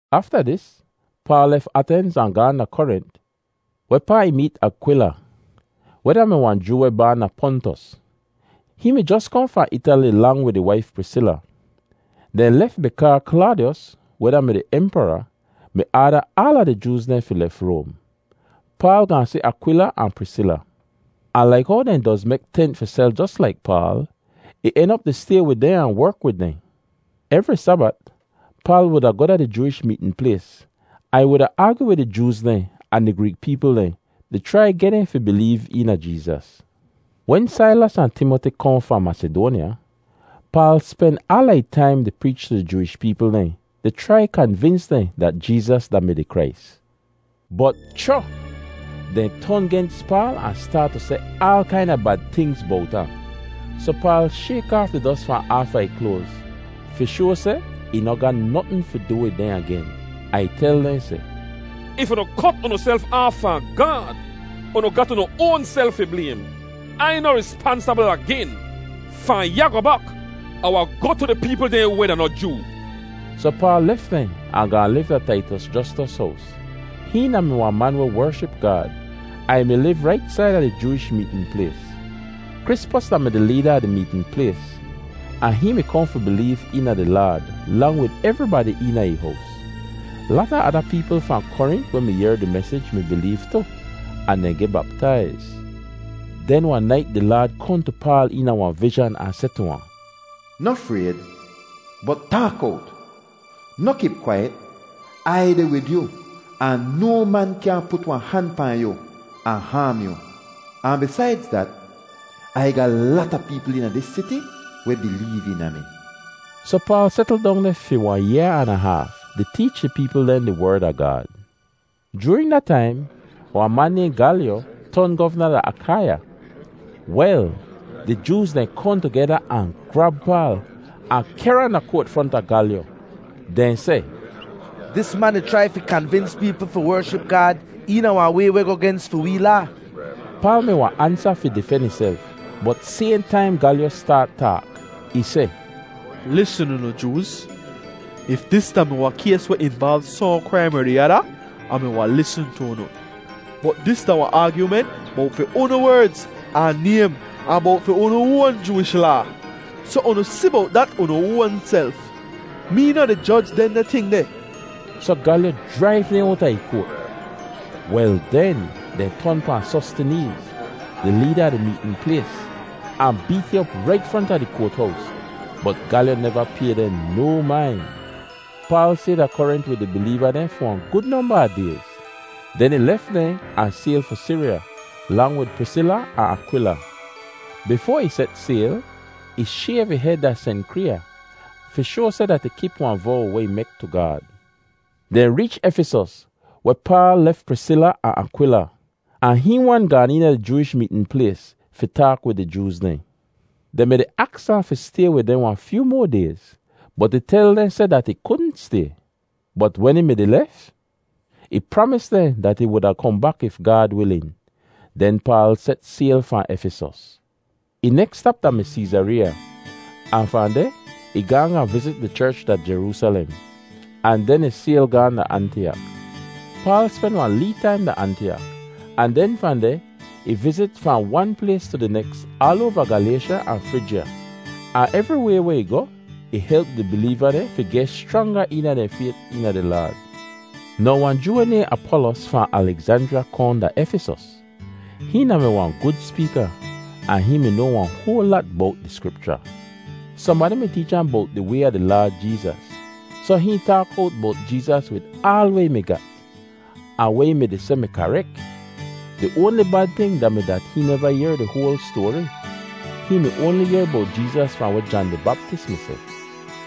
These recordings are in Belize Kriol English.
Afta dis, Paal lef Atenz ahn gaahn da Korint, wehpaa ih meet Akwila, weh da-mi wahn Joo weh baan da Pontus. Hihn mi jos kohn fahn Itali lang wid ih waif, Prisila. Dehn lef bikaa Klaadiyos, weh da-mi di Empara, mi aada aala di Jooz dehn fi lef Roam. Paal gaahn si Akwila ahn Prisila, ahn laik how dehn doz mek tent fi sel jos laik Paal, ih en op di stay wid dehn ahn werk wid dehn. Evri Sabat Paal wuda goh da di Jooish meetn plays ahn ih wuda aagyu wid di Jooz dehn ahn di Greek peepl dehn, di chrai geh dehn fi bileev eena Jeezas. Wen Sailas ahn Timoti kohn fahn Masidoanya, Paal spen aala ih taim di preech tu di Jooish peepl dehn di chrai kanvins dehn dat Jeezas da-mi di Krais. Bot, cho! Dehn ton gens Paal ahn staat tu seh aal kaina bad tingz bowt ahn. Soh Paal shayk aaf di dos fahn aafa ih kloaz fi shoa seh ih noh ga notn fi du wid dehn agen, ahn ih tel dehn seh, “If unu kot unuself aaf fahn Gaad, unu gat unu oanself fi blaym. Ai noh rispansabl agen. Fahn ya goh bak, Ah wahn goh tu di peepl dehn weh da noh Joo.” Soh Paal lef dehn ahn gaahn liv da Taitos Jostos hows. Hihn da-mi wahn man weh wership Gaad ahn ih mi liv rait saida di Jooish meetn plays. Krispos da-mi di leeda a di meetn plays, ahn hihn mi kohn fi bileev eena di Laad, lang wid evribadi eena ih hows. Lata ada peepl fahn Korint weh mi yehr di mesij bileev tu, ahn dehn geh baptaiz. Den wahn nait di Laad kohn tu Paal eena wahn vizhan ahn seh tu ahn, “Noh frayd, bot taak owt. Noh kip kwaiyet. Ai deh wid yu ahn no man kyaahn put wahn han pahn yu ahn haam yu; ahn bisaidz dat, Ai ga lata peepl eena dis siti weh bileev eena mi.” Soh Paal setl dong deh fi wahn yaa an a haaf di teech di peepl dehn di Werd a Gaad. Joorin da taim, wahn man nayhn Galyo ton govna da Akaiya. Wel, di Jooz dehn kohn tugeda ahn grab Paal, ahn kehr ahn da koat fronta Galyo. Dehn seh, “Dis man di chrai fi kanvins peepl fi wership Gaad eena wahn way weh goh gens fi wee laa.” Paal mi wahn ansa fi difen ihself, bot sayhn taim Galyo staat taak. Ih seh, “Lisn, unu Jooz, if dis da-mi wahn kays weh involv sohn kraim er di ada, Ah mi wahn lisn tu unu, bot dis da wahn aagyument bowt fi unu werdz, ahn naym, ahn bowt fi unu oan Jooish Laa. Soh unu si bowt dat, unu oanself. Mee noh di joj dehndeh ting deh.” Soh Galyo jraiv dehn owta ih koat. Wel den, dehn ton pahn Sostineez, di leeda a di meetn plays, ahn beet hihn op rait fronta di koat-hows. Bot Galyo neva pay dehn no main. Paal stay da Korint wid di bileeva dehn fi wahn gud nomba a dayz, den ih lef dehn ahn sayl fi Siriya, lang wid Prisila ahn Akwila. Bifoa ih set sayl, ih shayv ih hed da Senkriya fi shoa seh dat ih kip wahn vow weh ih mi mek tu Gaad. Dehn reech Efisos, weh Paal lef Prisila ahn Akwila, ahn hihn wan gaan eena di Jooish meetn plays fi taak wid di Jooz dehn. Dehn mi-di aks ahn fi stay wid dehn wahn fyoo moa dayz, bot ih tel dehn seh dat ih kudn stay. Bot wen ih mi-di lef, ih pramis dehn dat ih wahn kohn bak if Gaad wilin. Den Paal set sayl fahn Efisos. Ih neks stap da-mi Seezareeya, ahn fahn deh ih gaahn gaahn vizit di cherch da Jeroosalem, ahn den ih sayl gaahn da Antiyak. Paal spen wahn lee taim da Antiyak, ahn den fahn deh ih vizit fahn wan plays tu di neks aal oava Galaysha ahn Frijya, ahn evriway weh ih goh, ih help di bileeva dehn fi geh schranga eena dehn fayt eena di Laad. Now wahn Joo weh nayhn Apolos fahn Alegzanjriya kohn da Efisos. Hihn da-mi wahn gud speeka ahn hihn mi noa wahn hoal lat bowt di Skripcha. Sohnbadi mi teech ahn bowt di Way a di Laad Jeezas, soh hihn taak owt bowt Jeezas wid aal weh ih mi gat, ahn weh ih mi-di seh mi karek. Di oanli bad ting da-mi dat hihn neva yehr di hoal stoari. Hihn mi oanli noa bowt Jeezas fahn weh Jan di Baptis mi seh.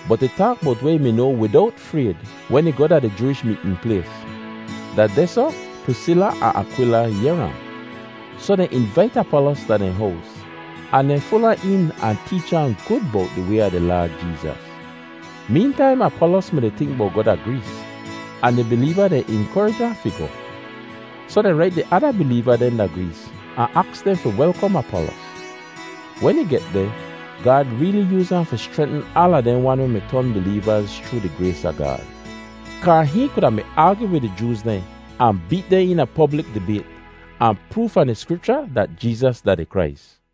Bot ih taak bowt weh ih mi noa widowt frayd wen ih goh da di Jooish meetn plays. Da dehsoh Prisila ahn Akwila yehr ahn. Soh dehn invait Apolos da dehn hows ahn dehn ful ahn een ahn teech ahn gud bowt di Way a di Laad Jeezas. Meentaim Apolos mi-di tink bowt goh da Grees, ahn di bileeva dehn inkorij ahn fi goh. Soh dehn rait di ada bileeva dehn da Grees ahn aks dehn fi welkom Apolos. Wen ih get deh, Gaad reeli yooz ahn fi schrentn aala dehn wan weh mi ton bileevaz chroo di grays a Gaad, kaa hihn kuda mi aagyu wid di Jooz dehn ahn beet dehn eena poblik dibayt ahn proov fahn di Skripcha dat Jeezas da di Krais.